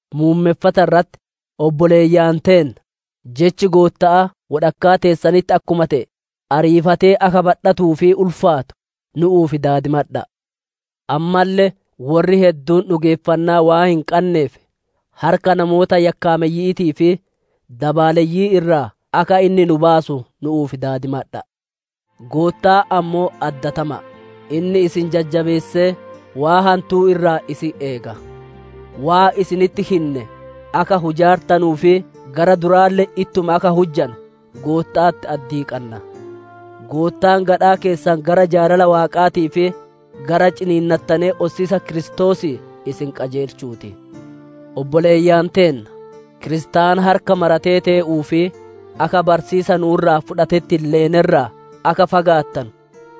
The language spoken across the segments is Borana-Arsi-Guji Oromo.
Muummeffata irratti, obboleeyyan teenna! Jechi Gootta'aa wodhakkaa teessanitti akkuma te'e, ariifatee akka badhatuu fi ulfaatu nu'uuf daadimadha'a. Ammalle worri hedduun dhugeeffannaa waan hin qanneef, harka namoota yakkaameyyi'iitii fi dabaaleyyi'ii irraa akka inni nu baasu nu'uuf daadimadha'a. Goottaan ammoo addatama'a; inni isin jajjabeessee, waan hantuu irraa isin eega. Waan isinitti hinne akka hujaartanuu fi gara duraalle ittuma akka hujjanu Gootta'atti addii qanna. Goottaan gadhaa keessan gara jaalala Waaqaatii fi gara ciniinnatee ossiisa Kiristoosii isin qajeelchuu ti. Obboleeyyan teenna! Kiristaana harka maratee tee'uu fi akka barsiisa nu'u irraa fudhatetti hin leene irraa akka fagaattanu,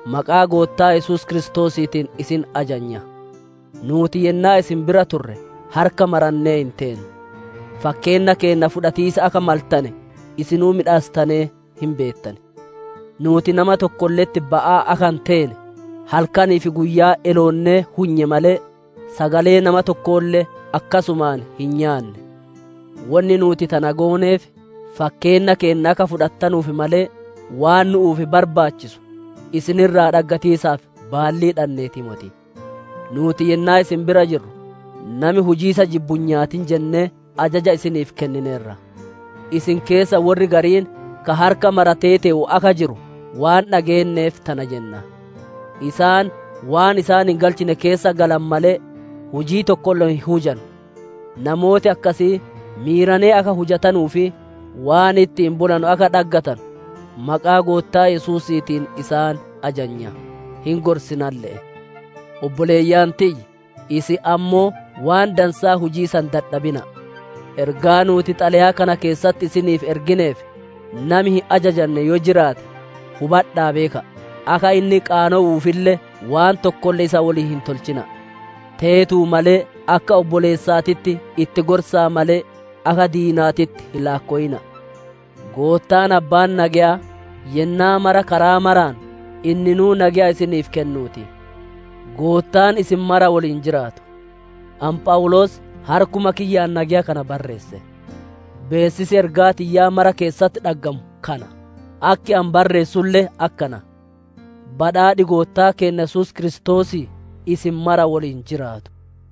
maqaa Goottaa Yesuus Kiristoosiitiin isin ajanya. Nuuti yennaa isin bira turre harka marannee hin teenne. Fakkeenna keenna fudhatiisa akka maltane isinuu miidhaassitanee hin beettan. Nuuti nama tokkolle'etti ba'aa akka hin teene, halkanii fi guyyaa eloonnee hunye malee, sagalee nama tokkoolle akkasumaan hin nyaanne. Wonni nuuti tana gooneef fakkeenna keenna akka fudhattanuuf malee, waan nu'uuf barbaachisu isin irraa dhaggatiisaaf baallii dhanneetii moti. Nuuti yennaa isin bira jirru, «Nami hujiisa jibbu hin nyaatin» jennee ajaja isiniif kennineerra. Isin keessa worri gariin ka harka maratee tee'u akka jiru waan dhageenneef tana jenna; isaan waan isaan hin galchine keessa galan malee, hujii tokkolle hin hujanu. Namooti akkasii, miiranee akka hujatanuu fi waan ittiin bulanu akka dhaggatanu maqaa Goottaa Yesuusiitiin isaan ajanya; hin gorisinalle'e. Obboleeyyan tiyya! Isin ammoo waan dansaa hujiisa hin dadhabina'a. Ergaa nuuti xalayaa kana keessatti isiniif ergineef, nami hin ajajanne yoo jiraate, hubadha'aa beeka'a; akka inni qaanowuufille waan tokkolle isa woliin hin tolchina'a. Teetuu malee akka obboleessaatitti itti gorsa'a malee, akka diinaatitti hin laakkowina'a. Goottaan abbaan nageyaa, yennaa mara karaa maraan, inninuu nageya isiniif kennuu ti. Goottaan isin mara woliin jiraatu. Ani Phawuloos harkuma kiyyaan nageya kana barreesse. Beessisi ergaa tiyya mara keessatti dhaggamu kana; akki ani barreessulle akkana. Badhaadhi Goottaa keenna Yesuus Kiristoosii isin mara woliin jiraatu.